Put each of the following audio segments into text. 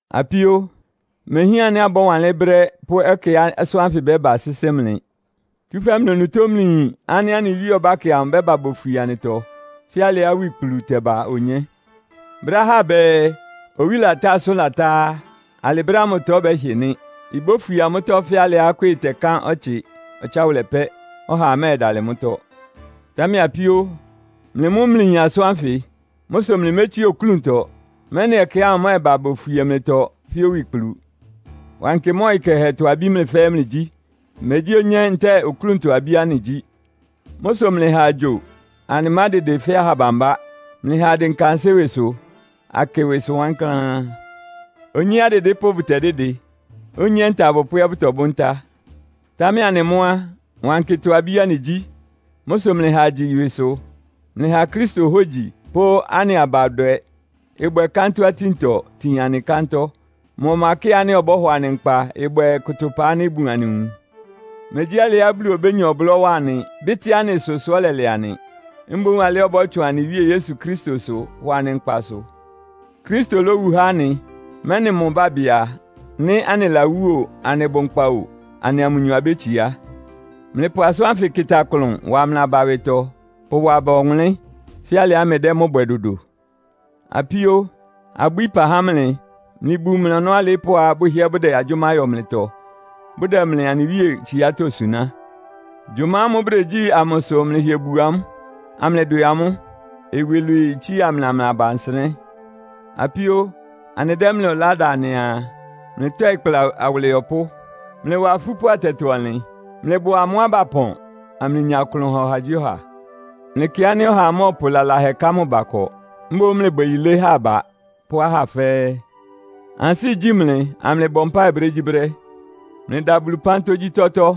Apíó, imehián ánɩ́ abɔ́wanlɩ́n brɛ́ pʋ́ ɛkɛá asʋ́n ánfɩ ɩbɛ́ba sɩ́sɩ́ mlɩ. Tsúfɛ́ mlɩ onutó mlɩyin ánɩ́ anɩ Wíe ɔbákɛ amʋ ɩbɛ́ba bofwie anɩtɔ, fɛ́ alɩá owikplu tɛba onyé. Brɛ́á ahá bɛɛ, “Owí latá, asʋ́n latá” á, alɩ brɛ́ ámʋtɔ bɛ́hɩ nɩ́. Ibófwie amʋ́tɔ́ fɛ́ alɩá ɩkwɩ́ɩ tɛkan ɔtsɩ ɔtsáwʋlɛ pɛ́. Ɔhaa mɛ́ɛdalɩ mʋ́tɔ́. Támɛ apíó, mlɩ mʋ́ mlɩyin asʋ́n ánfɩ. Mʋ́ sʋ mlɩmétsíe oklúntɔ, mɛ́nɩ ɛkɛ ámʋ mɛ́ɛba bofwie mlɩtɔ fɛ́ owikplu. Wankɩ mʋ́a ɔyɩ kɛhɛtɔ abí mlɩ fɛ́ɛ́ mlɩgyí. Megyí onyé ntɛ́ɛ oklúntɔ abí anɩgyí. Mʋ́ sʋ mlɩha agyo, anɩmádɩdɩ fɛ́ aha bambá. Mlɩha adɩnka ansɩ́ ɩwɩsʋ, akɩ ɩwɩsʋ wankláán. Onyé, adɩdɩ́pʋ́ bʋtɛdɩ́dɩ. Onyé, nta abʋpʋ́ ɛ́ bʋtɔbʋ́ ntá. Támɛ anɩ mʋ́ á, wankɩtɔ abí anɩgyí. Mʋ́ sʋ mlɩha agyi ɩwɩsʋ. Mlɩha Kristo hógyi pʋ́ anɩ abadwɛ ɩbwɛ kántɔ́-atíntɔ tin anɩ kántɔ́. Mʋ ɔkpakɩ́ɩ ánɩ́ ɔbɔ́hɔ anɩ nkpa ɩbwɛ́ɛ kʋtʋpa ánɩ́ ibun anɩ nwun. Megyí alɩá Bulu obénya ɔblɔ́ wa anɩ, bɩ́tɩ́ anɩ ɩsʋ sʋ́ ɔlɛlɛ anɩ. Mboún alɩá ɔbɔ́tsʋn anɩ Wíe Yesu Kristosʋ hɔ anɩ nkpa sʋ. Kristo lówu há anɩ, mɛ́nɩ mʋ bábɩ a, nɩ́ anɩlawú o, anɩbʋ nkpa o, anɩa mʋnyɔ abétsiá. Mlɩpʋ asʋ́n ánfɩ kɩta klʋn wa aba ɩwɩtɔ, pʋwa aba ɔwʋnlɩ́n, fɛ́ alɩá mlɩdɛ́ mʋ́ bwɛ dodo. Apíó, abwíí ɩpa há mlɩ, mlɩbu mlɩ ɔnɔ́ alɩɩ́pʋ́á bʋhɩ́ɛ́ bʋdɛ agyʋ́má yɔ mlɩtɔ, bʋdɛ mlɩ anɩ Wíe tsiátɔ́ suná. Gyʋma ámʋ́ʋ́ bʋdegyí amʋ sʋ mlɩhɩɛ bu amʋ́, amlɩdwɛ amʋ́. Iwilwii itsía mlɩa mlɩ aba nsɩnɛ́. Apíó, anɩdɛ́ mlɩ ɔlá da anɩaa, mlɩtɔɩ kpla awʋlɩyɔpʋ́. Mlɩwa afúpʋ́ atɛtɔ-ɔnlɩn. Mlɩbʋa amʋ́á bapɔn, amlɩnya klʋn ha ɔhagyíɔha. Mlɩkɩ ánɩ́ ɔhaa mɔ́ɔpʋ lalahɛ ká mʋ ba ɩkɔ. Mboún mlɩbwɛ yilé há aba pʋ́ ahá fɛ́ɛ́. Ansɩ́ igyí mlɩ, amlɩbɔ mpáɩ brégyíbrɛ́. Mlɩda Bulu ɩpán tógyítɔ́tɔ́.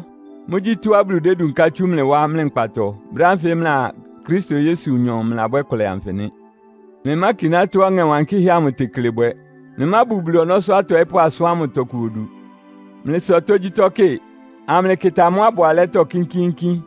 Mʋ́gyí tɔ́á Bulu dédunká tsú mlɩ wá mlɩ nkpatɔ, brɛ́ ánfɩ mlɩa Kristo Yesunyɔ mlɩlabwɛ́ ɩkʋlɛ anfɩ nɩ́. Mlɩmákiná tɔ́á Ɔŋɛ Wankɩ́hɛ́ amʋ tekle bwɛ. Mlɩmábu Bulu ɔnɔ́sʋ́ atɔɩ́pʋ́ asʋ́n ámʋ tɔkʋ odu. Mlɩsɔ tógyítɔ́ kɩ, amlɩkɩta mʋ́á ɩbʋ alɛ́tɔ́ kínkíínkín.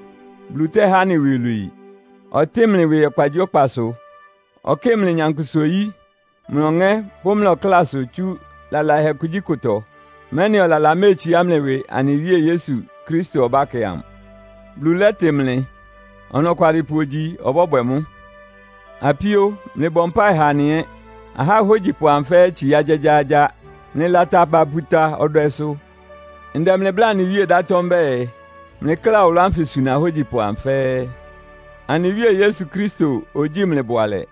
Bulu tɛ́há anɩ iwilwii. Ɔtɩ́ɩn mlɩ ɩwɩ ɔkpagyíɔkpasʋ. Ɔkɩ́ɩ mlɩ nyankpʋsa-oyí, mlɩ ɔŋɛ́ pʋ́ mlɩ ɔklásʋ tsú lalahɛ kugyíkʋtɔ, mɛ́nɩ ɔlala méetsiá mlɩ ɩwɩ anɩ Wíe Yesu Kristo ɔbákɛ amʋ. Bulu lɛ́tɩ mlɩ. Ɔnɔkwalɩpʋ ogyi, ɔbɔ́bwɛ mʋ́. Apíó, mlɩbɔ mpáɩ ha anɩ ɛ́. Ahá ahógyipʋ amʋ fɛ́ɛ́ itsiá gyágyáágyá. Mlɩlata aba puta ɔdwɛsʋ. Ndɛ mlɩ bláa anɩ Wíe ɩdátɔ́ mbɛ́ɛ, mlɩkla ɔwʋlʋ́ ánfɩ suna ahógyipʋ amʋ fɛ́ɛ́. Anɩ Wíe Yesu Kristo ogyíi mlɩ bʋalɛ.